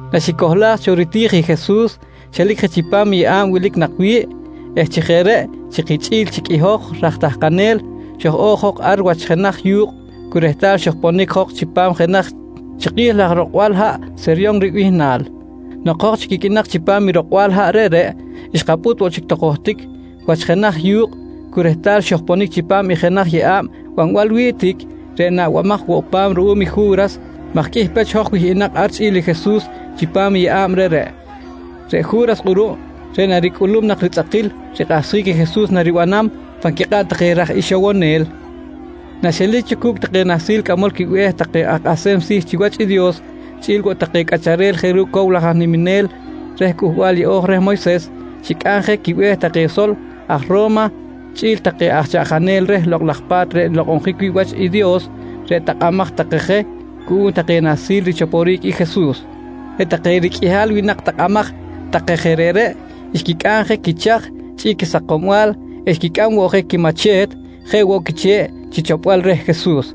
Naxicohlaj cho riti̱j i Jesus, xelic je chipam i yeꞌa̱b wilic nak wi̱ꞌ eh chi jeꞌ reꞌ chi kichꞌi̱l chic i hoj raj tahkanel xoj-o̱j jok ar wach jenaj yu̱kꞌ cu rehtal xojponic jok chipam jenaj chiki̱j laj rokbal haꞌ Seyron ribihnal. Nok hoj chic iqꞌuinak chipam i rokbal haꞌ reꞌreꞌ, xkapꞌut woꞌ chic tok johtic wach jenaj yu̱kꞌ cu rehtal xojponic chipam i jenaj yeꞌa̱b banbal wi̱ꞌ tic, reꞌ naꞌbamaj woꞌ pa̱m ruꞌum i Ju̱ras maj qꞌuih pech hoj wihꞌinak ar chꞌi̱l i Jesus chipam i yeꞌa̱b reꞌreꞌ. Reꞌ Ju̱ras kꞌuruꞌ reꞌ naricꞌulum nak ritzꞌakil rikꞌahsjic i Jesus naribanam pan quikꞌab take raj ixowonel, naxelic cho cu̱cꞌ take nahsil cꞌamol quibe̱h take aj kꞌahsem si̱ chiwach i Dios chꞌi̱l woꞌ take cꞌacharel jeꞌ ru̱cꞌ cow laj aj niminel reh Cꞌuhbal Yeꞌo̱j reh Moyses, xicꞌam je quibe̱h take sol aj Ro̱ma chꞌi̱l take aj chaꞌjanel reh Lokꞌ laj Pa̱t reꞌ nlokꞌonjic wi̱ꞌ wach i Dios, reꞌ takꞌamaj take je cuꞌum take nahsil richoporic i Jesus. Reꞌ take riqꞌuihal winak takꞌamaj take je reꞌreꞌ xquicꞌam je quichaj chi quisakombal eh xquicꞌam woꞌ je quimache̱t jeꞌ woꞌ quiche̱ꞌ chi chopbal reh Jesus.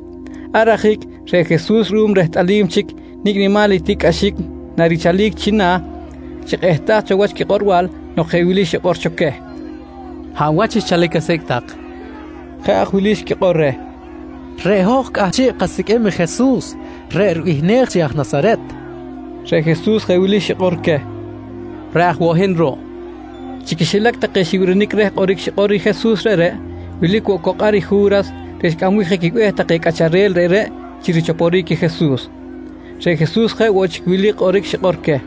Ar ajic reꞌ Jesus ruꞌum rehtꞌalim chic nicꞌ nimal i tiꞌcꞌaxic narichalic china̱, xikꞌehtaj cho wach quikꞌorbal nok jeꞌ wili xikꞌor cho queh: «Hab wach xchalic asicꞌ tak? nqui queh. Jeꞌ aj wili xquikꞌor reh: «Reꞌ hoj cꞌahchiꞌ kasiqꞌuim i Jesus reꞌ ribihnej chi aj Nasaret, nqui take. Reꞌ Jesus jeꞌ wili xikꞌor queh: «Reꞌ aj woꞌ hin ruꞌ, nqui queh. Chi quixilac take xibirinic reh kꞌoric xikꞌor i Jesus reꞌreꞌ, wilic woꞌ cok ar i Ju̱ras reꞌ xcꞌambic je quibe̱h take cꞌacharel reꞌreꞌ chi richoporic i Jesus. Reꞌ Jesus jeꞌ woꞌ chic wili xikꞌor queh: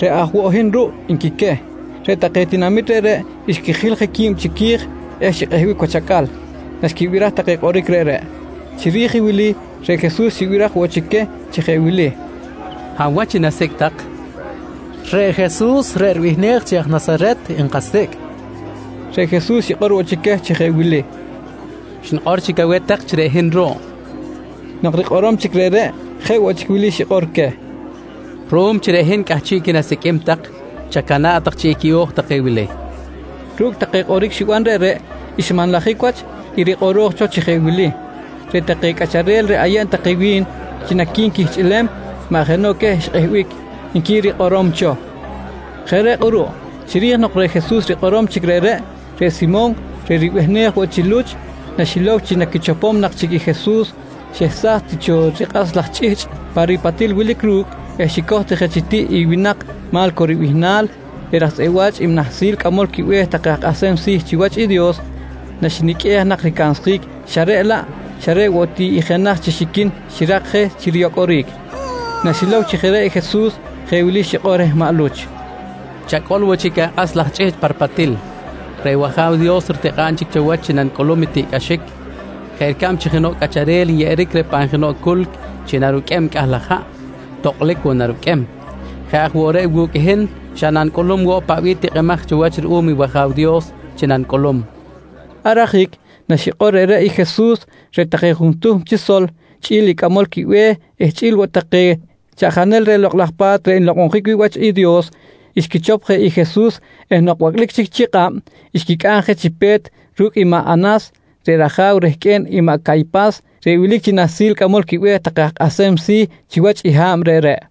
«Reꞌ aj woꞌ hin ruꞌ, nqui queh. Reꞌ take tinamit reꞌreꞌ xquijil je qui̱b chiqui̱j eh xikꞌehbic wach acꞌal naxquibiraj take kꞌoric reꞌreꞌ. Chiri̱j i wili reꞌ Jesus xibiraj woꞌ chic queh chi jeꞌ wili: «Hab wach i nasicꞌ tak? nqui queh. —Reꞌ Jesus reꞌ ribihnej chi aj Nasaret nkasicꞌ, nqui take. Reꞌ Jesus xikꞌor woꞌ chic queh chi jeꞌ wili: «Xnikꞌor chic aweh tak chi reꞌ hin ruꞌ, nqui queh. Nok rikꞌorom chic reꞌreꞌ, jeꞌ woꞌ chic wili xikꞌor queh: «Ruꞌum chi reꞌ hin cꞌahchiꞌqui̱n asiqꞌuim tak, chacana̱ꞌ tak chi equiꞌo̱j take wili, nqui queh. Ru̱cꞌ take kꞌoric xiban reꞌreꞌ xmanlajic wach i rikꞌoroj cho chi jeꞌ wili: “Reꞌ take cꞌacharel reꞌ ayeb take wi̱n chi naquinquichꞌihlem maꞌ jenoꞌ queh xikꞌehbic, nqui rikꞌorom cho. Jeꞌ reꞌ kꞌuruꞌ chiri̱j nok reꞌ Jesus rikꞌorom chic reꞌreꞌ, reꞌ Simon reꞌ ribihnej woꞌ chi Luch naxilow chi naquichopom nak chic i Jesus xehsaj ti cho rikꞌas laj chꞌihchꞌ pa ripatil wilic ru̱cꞌ eh xicoj ti je chi tiꞌ i winak Ma̱lco ribihnal, reꞌ raj tzꞌeꞌ wa̱ch i nahsil cꞌamol quibe̱h take aj kꞌahsem si̱ chiwach i Dios, naxiniqꞌuej nak ricansjic xa reꞌ laꞌ, xa reꞌ woꞌ ti i jenaj chi xiquin xirak je riyocꞌoric. Naxilow chi jeꞌ reꞌ i Jesus, jeꞌ wili xikꞌor reh maꞌ Luch: «Chacꞌol woꞌ chic akꞌas laj chꞌihchꞌ pa ripatil. Reꞌ wAja̱w Dios ritikꞌa̱b chic cho wach chi nanicꞌulum i tiꞌcꞌaxic. Jeꞌ ricab chi jenoꞌ cꞌacharel nyeꞌeric reh pan jenoꞌ culc chi naruqꞌuem i cꞌah laj haꞌ, tokꞌlic woꞌ naruqꞌuem, jeꞌ aj woꞌ reꞌ wu̱cꞌ i hin xa nanicꞌulum woꞌ i paꞌ bih tikꞌimaj cho wach ruꞌum i wAja̱w Dios chi nanicꞌulum, nqui reh. Ar ajic naxikꞌor reꞌreꞌ i Jesus, reꞌ take juntuhm chi sol chꞌi̱l i cꞌamol quibe̱h eh chꞌi̱l woꞌ take chaꞌjanel reh Lokꞌ laj Pa̱t reꞌ nlokꞌonjic wi̱ꞌ wach i Dios, xquichop i Jesus eh nok bacꞌlic chi kꞌab, xquicꞌam je chi pe̱t ru̱cꞌ i maꞌ Anas reꞌ raja̱w rehqꞌue̱n i maꞌ Caypas reꞌ wilic chi nahsil cꞌamol quibe̱h take aj kꞌahsem si̱ chiwach i ha̱b reꞌreꞌ.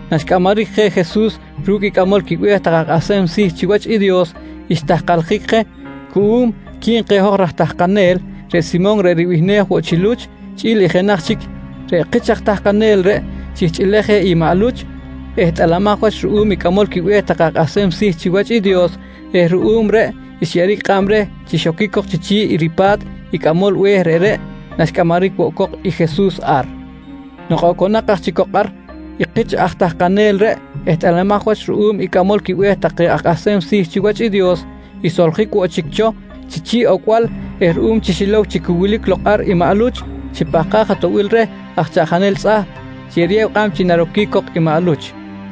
Naxcꞌamaric je Jesus ru̱cꞌ i cꞌamol quibe̱h take aj kꞌahsem si̱ chiwach i Dios, xtahkaljic je cuꞌum quib keh hoj raj tahkanel, reꞌ Simon reꞌ ribihnej woꞌ chi Luch chꞌi̱l i jenaj chic kich aj tahkanel. Reꞌ kich aj tahkanel reꞌ xihchꞌilej je i maꞌ Luch, ehtꞌalamaj wach ruꞌum i cꞌamol quibe̱h take aj kꞌahsem si̱ chiwach i Dios eh ruꞌum reꞌ xyeꞌeric kꞌab reh chi xoquic cok chiꞌ ripa̱t i cꞌamol be̱h reꞌreꞌ naxcꞌamaric woꞌ cok i Jesus ar. Nok oconak aj chic cok ar i kich aj tahkanel reꞌ ehtꞌalamaj wach ruꞌum i cꞌamol quibe̱h take aj kꞌahsem si̱ chiwach i Dios, xsoljic woꞌ chic cho chi chi̱ꞌ ocbal eh ruꞌum chi xilow chi cu wilic lok ar i maꞌ Luch, xipahkaj atoꞌbil reh aj chaꞌjanel tzꞌahp chi eriyew kꞌab chi naroquic cok i maꞌ Luch.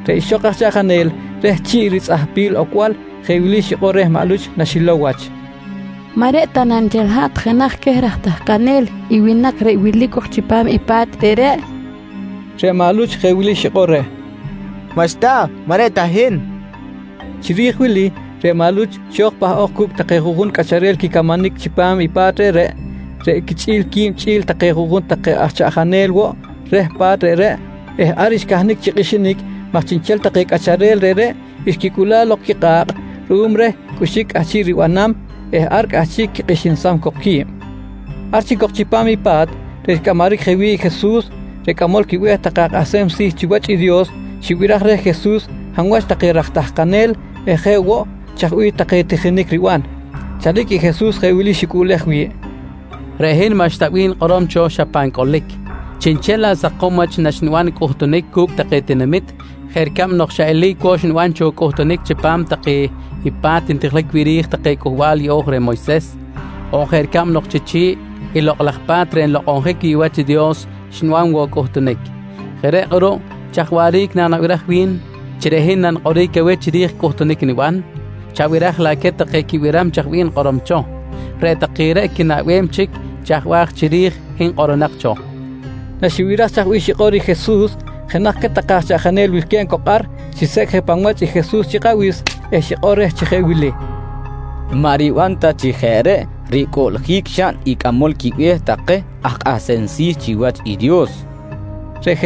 Reꞌ ixok aj chaꞌjanel reh chi̱ꞌ ritzꞌahpil ocbal, jeꞌ wili xikꞌor reh maꞌ Luch naxilow wach: «Maꞌ reꞌ ta na nchel hat jenaj queh raj tahkanel i winak reꞌ wilic cok chipam i pa̱t reꞌreꞌ? nqui reh. Reꞌ maꞌ Luch jeꞌ wili xikꞌor reh: «Maꞌxta! Maꞌ reꞌ ta hin, nqui reh. Chiri̱j wili reꞌ maꞌ Luch xo̱j pahꞌok cu̱cꞌ take juꞌjun cꞌacharel quicamanic chipam i pa̱t reꞌreꞌ, reꞌ quichꞌi̱l qui̱b chꞌi̱l take juꞌjun take aj chaꞌjanel woꞌ reh pa̱t reꞌreꞌ eh ar xcahnic chi kꞌixinic maj chiꞌnchel take cꞌacharel reꞌreꞌ xquicꞌula̱ꞌ lok quikꞌa̱kꞌ ruꞌum reh cꞌuxic cꞌahchiꞌ ribanam eh ar cꞌahchiꞌ quikꞌixinsam cok qui̱b. Ar chic cok chipam i pa̱t reꞌ xcꞌamaric je wi̱ꞌ i Jesus reꞌ cꞌamol quibe̱h take aj kꞌahsem si̱ chiwach i Dios xibiraj reh Jesus hab wach take raj tahkanel eh jeꞌ woꞌ chaj bih take tijinic riban. Chalic i Jesus jeꞌ wili xicꞌuꞌlej wi̱ꞌ: «Reꞌ hin maꞌxta bih nikꞌorom cho xa pan cꞌolic, chiꞌnchel laꞌ sakom wach naxniban i cꞌuhtunic cu̱cꞌ take tinamit jeꞌ ricab nok xa eli̱c woꞌ xniban cho cꞌuhtunic chipam take pa̱t ntijiljic wi̱ꞌ ri̱j take Cꞌuhbal Yeꞌo̱j reh Moyses on jeꞌ ricab nok chi chi̱ꞌ i Lokꞌ laj Pa̱t reꞌ nlokꞌonjic wi̱ꞌ wach i Dios xniban woꞌ i cꞌuhtunic. Jeꞌ reꞌ kꞌuruꞌ, chaj waꞌric nanabiraj wi̱n chi reꞌ hin nanikꞌoric aweh chiri̱j i cꞌuhtunic niban? Chabiraj laꞌ queh take quibiram chaj bih nikꞌorom cho. Reꞌ take reꞌ quinaꞌbem chic chaj bih aj chiri̱j hin kꞌoronak cho, nqui reh. Naxibiraj chaj bih xikꞌor i Jesus, jenaj queh take aj chaꞌjanel wilque̱b cok ar xisecꞌ je pan wach i Jesus chi kꞌabis eh xikꞌor reh chi jeꞌ wili: «Maꞌ riban ta chi jeꞌ reꞌ ricꞌuꞌljic xaꞌn i cꞌamol quibe̱h take aj kꞌahsem si̱ chiwach i Dios, nqui reh.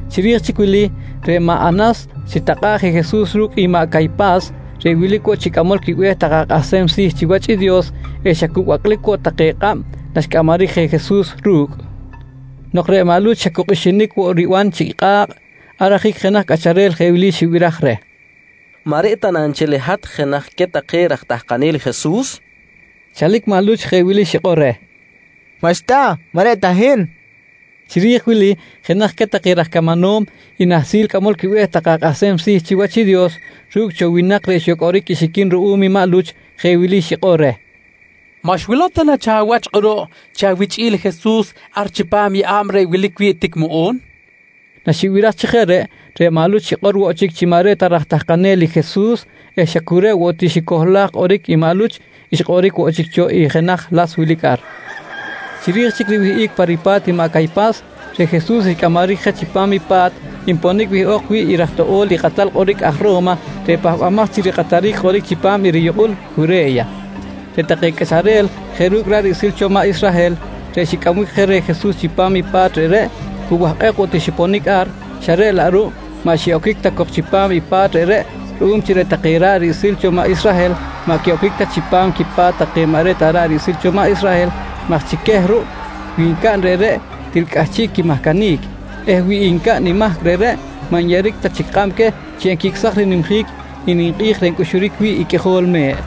Chiri̱j chic i wili reꞌ maꞌ Anas xitakꞌa̱ꞌ je Jesus ru̱cꞌ i maꞌ Caypas reꞌ wilic woꞌ chi cꞌamol quibe̱h take aj kꞌahsem si̱ chiwach i Dios eh xa cu bacꞌlic woꞌ take kꞌab naxcꞌamaric je Jesus ru̱cꞌ. Nok reꞌ maꞌ Luch xa cu kꞌixinic woꞌ riban chiꞌ kꞌa̱kꞌ, ar ajic jenaj cꞌacharel jeꞌ wili xibiraj reh: «Maꞌ reꞌ ta na nchel hat jenaj queh take raj tahkanel i Jesus? nqui reh. Chalic maꞌ Luch jeꞌ wili xikꞌor reh: «Maꞌxta! Maꞌ reꞌ ta hin, nqui. Chiri̱j wili jenaj queh take raj camanom i nahsil cꞌamol quibe̱h take aj kꞌahsem si̱ chiwach i Dios, ru̱cꞌ cho winak reꞌ xyocꞌoric i xiquin ruꞌum i maꞌ Luch, jeꞌ wili xikꞌor reh: «Maꞌ xwilow ta na cho awach kꞌuruꞌ chi awichꞌi̱l i Jesus ar chipam i yeꞌa̱b reꞌ wilic wi̱ꞌ tic muꞌu̱n? nqui banol reh. Naxibiraj chi jeꞌ reꞌ, reꞌ maꞌ Luch xikꞌor woꞌ chic chi maꞌ reꞌ ta raj tahkanel i Jesus eh xa cu reꞌ woꞌ ti xicohlaj kꞌoric i maꞌ Luch, xkꞌoric woꞌ chic cho i jenaj las wilic ar. Chiri̱j chic riwihꞌic pa ripa̱t i maꞌ Caypas, reꞌ Jesus xcꞌamaric je chipam i pa̱t nponic wihꞌok wi̱ꞌ i raj toꞌo̱l i kꞌatal kꞌoric aj Ro̱ma reꞌ pahbamaj chi rikꞌataric kꞌoric chipam i riyukꞌul Jure̱ya. Reꞌ take cꞌacharel jeꞌ ru̱cꞌ ra̱ꞌ riꞌsil cho maꞌ Israhel reꞌ xicꞌambic je reh Jesus chipam i pa̱t reꞌreꞌ, cu wahkꞌek woꞌ ti xiponic ar, xa reꞌ laꞌ ruꞌ maꞌ xiꞌoquic ta cok chipam i pa̱t reꞌreꞌ ruꞌum chi reꞌ take ra̱ꞌ riꞌsil cho maꞌ Israhel maꞌ quiꞌoquic ta chipam quipa̱t take maꞌ reꞌ ta ra̱ꞌ riꞌsil cho maꞌ Israhel maj chi queh ruꞌ wi ncaꞌn reꞌreꞌ til cꞌahchiꞌ quimahcanic eh wi ncaꞌn i mahc reꞌreꞌ maꞌ nyeꞌeric ta chic kꞌab queh chi enquicꞌsaj rinimjic i ninkꞌi̱j reꞌ ncꞌuxuric wi̱ꞌ i qꞌuijol me̱ꞌ.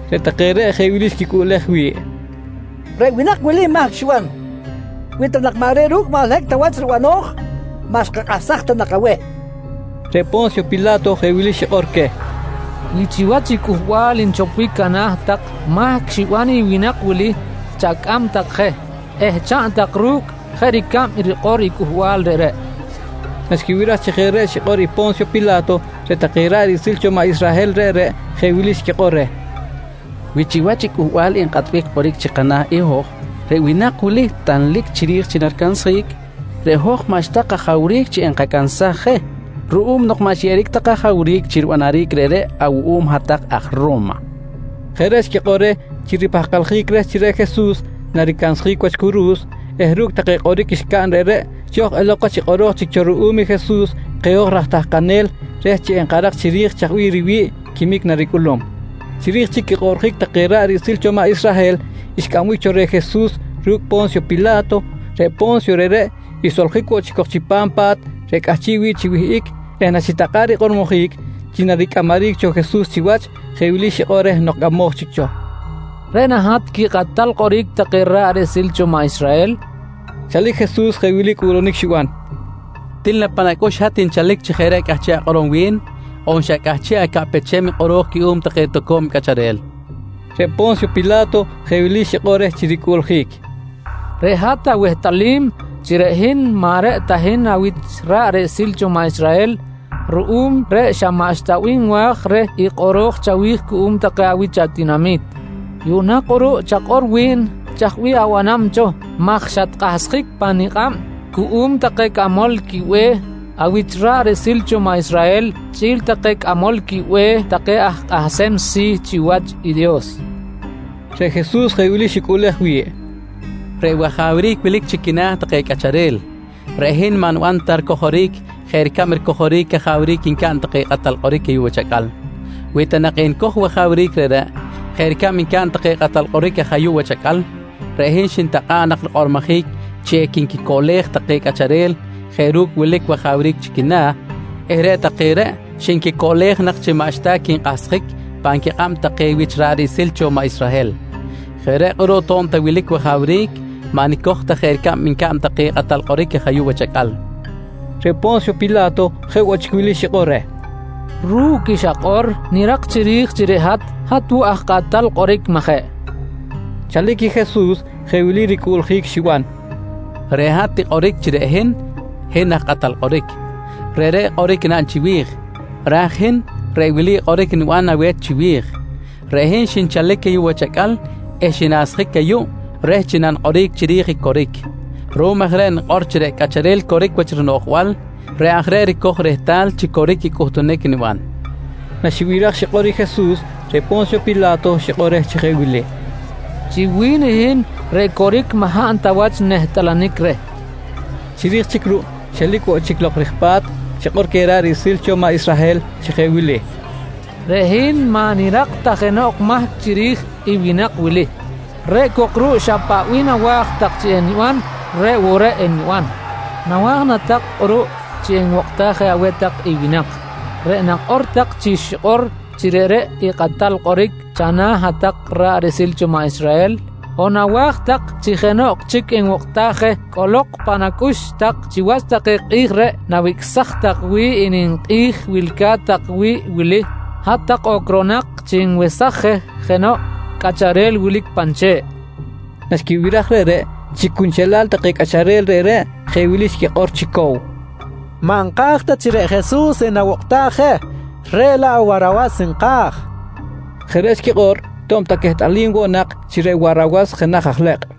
Reꞌ take reꞌ jeꞌ wili xquicꞌuꞌlej wi̱ꞌ: «Reꞌ winak wili mahc xiban. Wi ta nak maꞌ reꞌ ru̱cꞌ maꞌ holohic ta wach ribano̱j, maꞌ xkakꞌahsaj ta nak aweh, nqui take. Reꞌ Po̱nsyo Pila̱to jeꞌ wili xikꞌor queh: «Wi chiwach i Cꞌuhbal nchopbic ana̱ tak mahc xiban i winak wili, chacꞌam tak je eh chaꞌn tak ru̱cꞌ jeꞌ ricab rikꞌor i cꞌuhbal reꞌreꞌ, nqui queh. Naxquibiraj chi jeꞌ reꞌ xikꞌor i Po̱nsyo Pila̱to reꞌ take ra̱ꞌ riꞌsil cho maꞌ Israhel reꞌreꞌ jeꞌ wili xquikꞌor reh: «Wi chiwach i cꞌuhbal nkꞌatbic kꞌoric chi kana̱ i hoj, reꞌ winak wili tanlic chiri̱j chi naricansjic, reꞌ hoj maꞌxta kajawric chi enkacansaj je ruꞌum nok maꞌ xyeꞌeric ta kajawric chi ribanaric reꞌreꞌ awuꞌum hat-tak aj Ro̱ma, nqui take reh. Jeꞌ reꞌ xquikꞌor reh chi ripahkaljic reh chi reꞌ Jesus naricansjic wach curu̱s eh ru̱cꞌ take kꞌoric xcaꞌn reꞌreꞌ, xo̱j elok wach i kꞌoro̱j chic cho ruꞌum i Jesus keh hoj raj tahkanel reh chi enkarak chiri̱j chaj bih riwi̱ꞌ quimic naricꞌulum. Chiri̱j chic quikꞌoꞌrjic take ra̱ꞌ riꞌsil cho maꞌ Israhel xcꞌambic cho reh Jesus ru̱cꞌ Po̱nsyo Pila̱to, reꞌ Po̱nsyo reꞌreꞌ xsoljic woꞌ chic cok chipam pa̱t reꞌ cꞌahchiꞌ wi̱ꞌ chi wihꞌic eh naxitakꞌa̱ꞌ rikꞌormojic chi naricꞌamaric cho Jesus chiwach, jeꞌ wili xikꞌor reh nok cꞌamoj chic cho: «Reꞌ na hat quikꞌatal kꞌoric take ra̱ꞌ riꞌsil take cho maꞌ Israhel? nqui reh. Chalic i Jesus jeꞌ wili cꞌuꞌlunic xiban: «Til na pan acꞌux i hat nchalic chi jeꞌ reꞌ cꞌahchiꞌ akꞌorom wi̱n on xa cꞌahchiꞌ acaꞌpechem i kꞌoro̱j cuꞌum take toco̱m cꞌacharel? nqui reh. Reꞌ Po̱nsyo Pila̱to jeꞌ wili xikꞌor reh chi ricꞌuꞌljic: «Reꞌ hat awehtꞌalim chi reꞌ hin maꞌ reꞌ ta hin awich ra̱ꞌ riꞌsil cho maꞌ Israhel, ruꞌum reꞌ xa maꞌxta bih nwa̱j reh i kꞌoro̱j chawi̱j cuꞌum take awich atinami̱t. Yuꞌna kꞌuruꞌ chakꞌor wi̱n, chaj bih abanam cho maj xatkꞌahsjic pa nikꞌab cuꞌum take cꞌamol quibe̱h awich ra̱ꞌ riꞌsil cho maꞌ Israhel chꞌi̱l take cꞌamol quibe̱h take aj kꞌahsem si̱ chiwach i Dios, nqui reh. Reꞌ Jesus jeꞌ wili xicꞌuꞌlej wi̱ꞌ: «Reꞌ wajawric wilic chi quina̱ take cꞌacharel, reꞌ hin maꞌ niban ta ricojoric jeꞌ ricab ricojoric cajawric ncaꞌn take kꞌatal kꞌoric ayuꞌ wach acꞌal. Wi ta nak enicoj i wajawric reꞌreꞌ jeꞌ ricab ncaꞌn take kꞌatal kꞌoric aj ayuꞌ wach acꞌal, reꞌ hin xintakꞌa̱ꞌ nak rikꞌormojic chi equinquicoꞌlej take cꞌacharel jeꞌ ru̱cꞌ wilic wajawric chi quina̱ eh reꞌ take reꞌ xinquicoꞌlej nak chi maꞌxta quinkꞌahsjic pan quicab take wich ra̱ꞌ riꞌsil cho maꞌ Israhel. Jeꞌ reꞌ kꞌuruꞌ to̱b ta wilic wajawric, maꞌ nicoj ta jeꞌ ricab ncaꞌn take kꞌatal kꞌoric aj ayuꞌ wach acꞌal, nqui reh. Reꞌ Po̱nsyo Pila̱to je woꞌ chic wili xikꞌor reh: «Ru̱cꞌ i xakꞌor nirak chiri̱j chi reꞌ hat, hat woꞌ aj kꞌatal kꞌoric, majeꞌ? nqui reh. Chalic i Jesus jeꞌ wili ricꞌuꞌljic xiban: «Reꞌ hat tikꞌoric chi reꞌ hin, hin aj kꞌatal kꞌoric. Reꞌreꞌ kꞌoric naꞌn chiwi̱j, raj i hin reꞌ wili kꞌoric niban aweh chiwi̱j: Reꞌ hin xinchalic ayuꞌ wach acꞌal eh xinasjic ayuꞌ reh chi nanikꞌoric chiri̱j i coric. Ruꞌum aj reꞌ nikꞌor chi reꞌ cꞌacharel coric wach rinoꞌjbal reꞌ aj reꞌ ricoj rehtal chi coric i cꞌuhtunic niban, nqui Jesus. Naxibiraj xikꞌor i Jesus, reꞌ Po̱nsyo Pila̱to xikꞌor reh chi jeꞌ wili: «Chi wi̱n i hin reꞌ coric maꞌ hab ta wach nehtꞌalanic reh, nqui xikꞌor. Chiri̱j chic ruꞌ xelic woꞌ chic lok rij pa̱t, xikꞌor queh ra̱ꞌ riꞌsil cho maꞌ Israhel chi jeꞌ wili: «Reꞌ hin maꞌ nirak ta jenoꞌ mahc chiri̱j i winak wili, reꞌ cok ruꞌ xa paꞌ bih nawa̱j tak chi eniban reꞌ woꞌ reꞌ eniban. Nawa̱j na tak kꞌuruꞌ chi enwokꞌtaj je aweh tak i winak reꞌ nakꞌor tak chi xikꞌor chi reꞌreꞌ i kꞌatal kꞌoric chana̱ hat-tak ra̱ꞌ riꞌsil cho maꞌ Israhel on nawa̱j tak chi jenoꞌ chic enwokꞌtaj je? Cꞌolok pan acꞌux tak, chiwach take kꞌi̱j reꞌ nawicꞌsaj tak wi̱ꞌ i ninkꞌi̱j wilca̱t tak wi̱ꞌ wili, hat-tak ocronak chi nwesaj je jenoꞌ cꞌacharel wilic pan che̱ꞌ, nqui queh. Naxquibiraj reꞌreꞌ, chi cunchelal take cꞌacharel reꞌreꞌ jeꞌ wili xquikꞌor chi cow: «Maꞌ nka̱j ta chi reꞌ Jesus enawokꞌtaj je, reꞌ laꞌ Warawas nka̱j, nqui take. Jeꞌ reꞌ xquikꞌor to̱b ta quehtꞌalim woꞌ nak chi reꞌ Warawas jenaj aj lekꞌ.